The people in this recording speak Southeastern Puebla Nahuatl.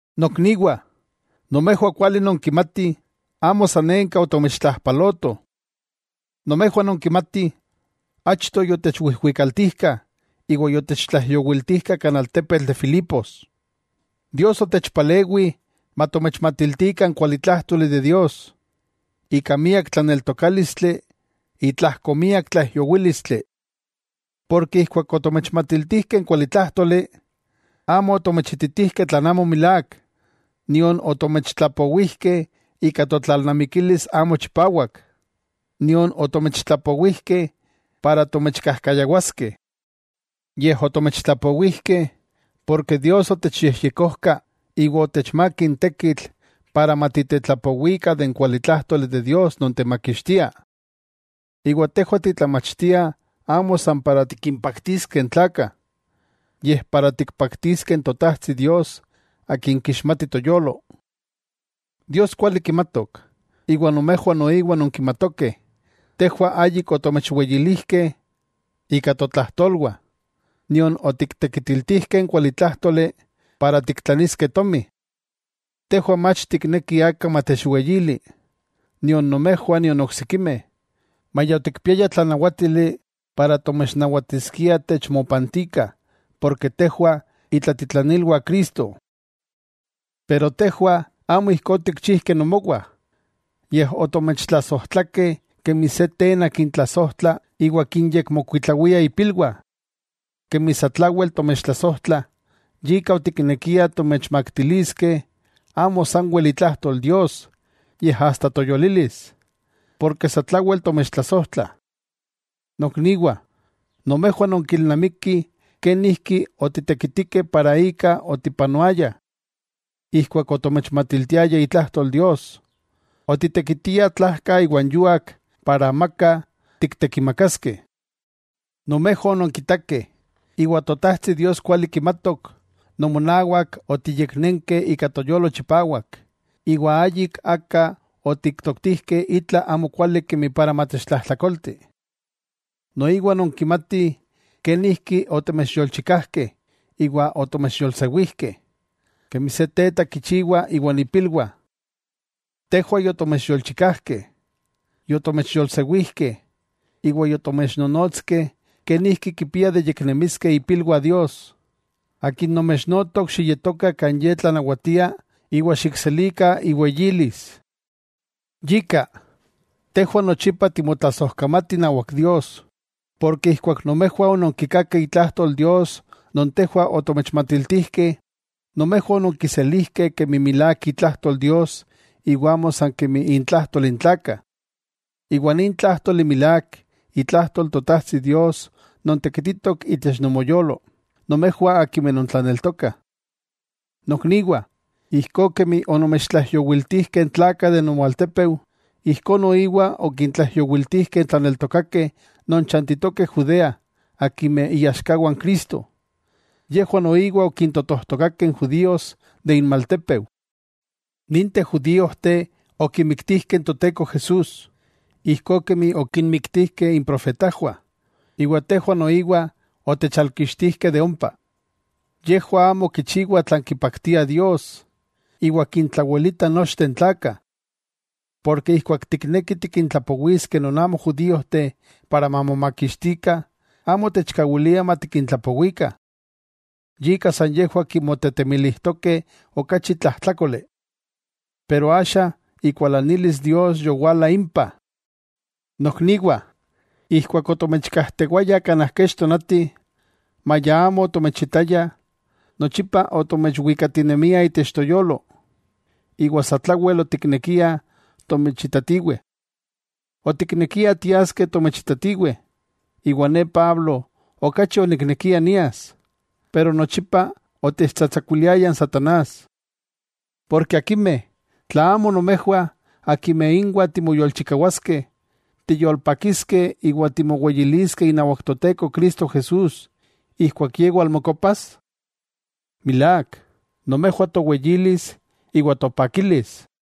Nokniwah, nomejwah kuali nonkimatih amo sanenka otomechtlajpalotoh. Nomejwah nonkimatih, achto yotechwijwikaltijkah iwa yotechtlaijyowiltijkah kan altepetl de Filipos. Dios otechpalewi matomechmatiltikah n kualitlájtoli de Dios, ika miak tlaneltokálistli itlajko miak tlaijyowílistli. Porke ijkuak otomechmatiltijkeh n kualitlájtoli, amo otomechititijkeh tlan amo milák, nion otomechtlapowijkeh ika totlalnamikilis amo chipawak, nion otomechtlapowijkeh para tomechkajkayawaskeh. Yej otomechtlapowijkeh porke Dios yotechyejyekojka iwa otechmák n tekitl para matitetlapowikah de n kualitlájtoli de Dios non techmakixtia. Iwa tejwah titlamachtiah amo san para tikimpaktiskeh n tlakah, yej para tikpaktiskeh n Totajtsi Dios Akin kixmati toyolo. Dios kuali kimatok, iwa nomejwah noiwa nonkimatokeh tejwah ayik otomechweyilijkeh ika totlajtolwah, nion otiktekitiltijkeh n kualitlájtoli para tiktlaniskeh tomi. Tejwah mach tiknekih aka matechweyili, nion nomejwah nion oksikimeh, maya otikpiayah tlanawátili para tomechnawatiskiah techmopantikah porke tejwah itlatitlanilwah Cristo. Pero tejwah amo ijkó otikchijkeh nomowah, yej otomechtlasojtlakeh kemi se tena kintlasojtla iwa kinyekmokuitlawia ipilwah. Kemi satlawel tomechtlasojtlah, yika otiknekiah tomechmaktiliskeh amo sanwel itlajtol Dios, yej asta toyolilis. ¡Porke satlawel tomechtlasojtlah! Nokniwah, nomejwah nonkilnamikih kenijki otitekitikeh para ika otipanoayah. Ijkuak otomechmatiltiayah itlajtol Dios, otitekitiah tlajka iwa n yuak para amaka tiktekimakaskeh. Nomejwah ononkitakeh, iwa Totajtsi Dios kuali kimatok nomonawak otiyeknenkeh ika toyolo chipawak, iwa ayik aka otiktoktijkeh itla amo kuali kemi para matechtlajtlakolti. Noiwa nonkimatih, kenijki otomechyolchikajkeh iwa otomechyolsewijkeh, kemi se teta kichiwa iwan ipilwah. Tejwah yotomechyolchikajkeh, yotomechyolsewijkeh, iwa yotomechnonotskeh kenijki kipiah de yeknemiskeh ipilwah Dios, Akin nomechnotok xiyetokah kan Ye tlanawatia iwa xikselikah iweyilis. Yika, tejwah nochipa timotlasojkamatih inawak Dios, porke ijkuak nomejwah ononkikakeh itlajtol Dios non tejwah otomechmatiltijkeh, nomejwah ononkiselijkeh kemi milák itlajtol Dios iwa amo san kemi intlajtol n tlakah. Iwa nin tlájtoli milák itlajtol Totajtsi Dios non tekititok itech nomoyolo nomejwah akimeh nontlaneltokah. Nokniwah, ijkó kemi onomechtlaijyowiltijkeh n tlakah de nomoaltepeu, ijkó noiwa okintlaijyowiltijkeh n tlaneltokakeh non chantitokeh Judea akimeh iaxkawah n Cristo, yejwah noiwa okintotojtokakeh n Judíos de inmaltépeu. Ninteh judíojteh okimiktijkeh n Toteko Jesús, ijkó kemi okinmiktijkeh improfetajwah, iwa tejwah noiwa otechalkixtijkeh de ompa. Yejwah amo kichiwah tlan kipaktia Dios, iwa kintlawelitah nochteh n tlakah. Porke ijkuak tiknekih tikintlapowiskeh non amo judíojteh para mamomakixtikah, amo techkawiliah matikintlapowikah. Yika san yejwah kimotetemilijtokeh okachi tlajtlákoli. Pero axa ikualanilis Dios yowala impah. Nokniwah, ijkuak otomechkajtewayah kanaj kech tonati, maya amo otomechitayah, nochipa otomechwikatinemiah itech toyolo, iwa satlawel otiknekiah tomechitatiweh. Otiknekiah tiaskeh tomechitatiweh, iwa ne Pablo okachi oniknekia nias, pero nochipa otechtsatsakuiliaya n satanás. Porke akimeh, ¿tla amo nomejwah, akimeh inwah timoyolchikawaskeh, tiyolpakiskeh, iwa timoweyiliskeh inawak Toteko Cristo Jesús, ijkuak Ye walmokopas? Milák, nomejwah toweyilis iwa topakilis.